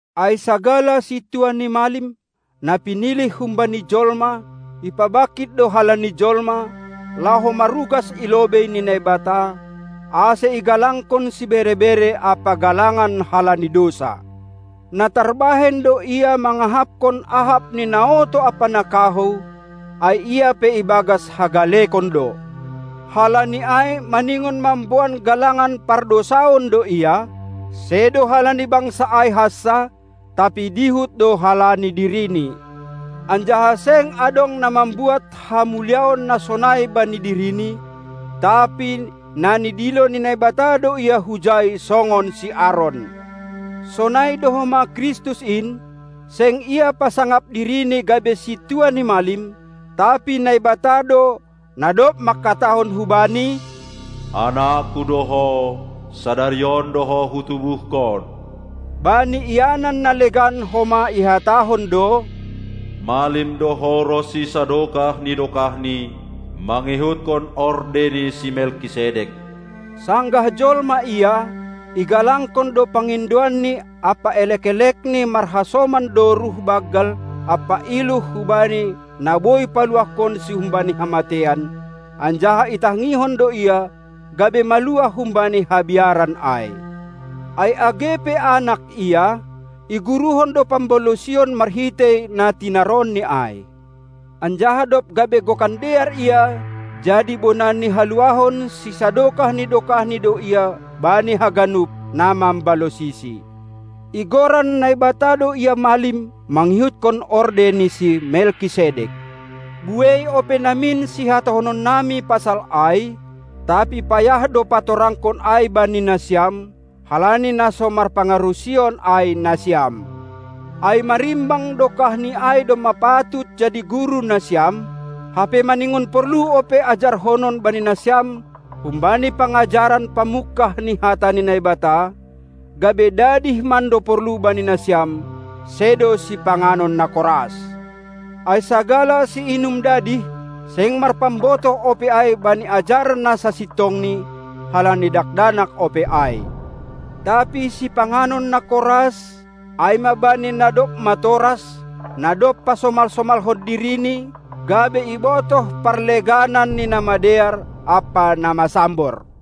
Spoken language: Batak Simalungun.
Ai sagala sintua ni malim, na pinilih humbani jolma, ipabangkit do halani jolma, laho marugas i lobei ni Naibata, ase igalangkon sibere-bere ampa galangan halani dousa. Na tarbahen do ia mangahapkon ahap ni na oto ampa na kahou, ai ia pe ibagas hagalekon do. Halani ai maningon mamboan galangan pardousaon do ia, sedo halani bangsa ai hansa, tapi dihut do halani dirini. Anjaha seng adong na mambuat hamuliaon na sonai bani dirini, tapi na nidilo ni Naibata do ia hujai songon si Aron. Sonai do homa Kristus in, seng Ia pasangap diriNi gabe Sintua ni malim, tapi Naibata do, na dob manghatahon hu Bani: "AnakKu do Ho, sadari on do Ho Hutubuhkon." Bani ianan na legan homa ihatahon do: Malim do Ho ronsi sadokah ni dokahni mangihutkon orde ni si Melkisedek. Sanggah jolma Ia, igalangkon do pangindoanNi ampa elek-elekNi marhasoman doruh banggal ampa iluh hubani na boi paluahkonSi humbani hamateian, anjaha itangihon do Ia, gabe maluah humbani habiaran ai. Ai age pe Anak Ia, iguruhon do pambalosion marhitei na tinaronNi ai. Anjaha dob gabe gokan dear Ia, jadi bona ni haluahon sisadokah ni dokahni do Ia bani haganup, na mambalosiSi. Igoran Naibata do Ia malim mangihutkon orde ni si Melkisedek. Buei ope namin sihatahononnami pasal ai, tapi payah do patorangkon ai bani nasiam, halani na so marpangarusion ai nasiam. Ai marimbang dokahni ai domma patut jadi guru nasiam, hape maningon porlu ope ajarhonon bani nasiam humbani pangajaran pamungkah ni hata ni Naibata, gabe dadih mando porlu bani nasiam, sedo sipanganon na koras. Ai sagala siinum dadih, seng marpambotoh ope ai bani ajaran na sasintongni, halani dakdanak ope ai. Tapi sipanganon na koras, ai ma bani na dob matoras, na dob pasomal-somalhon dirini, gabe ibotoh parleganan ni na madear ampa na masambor.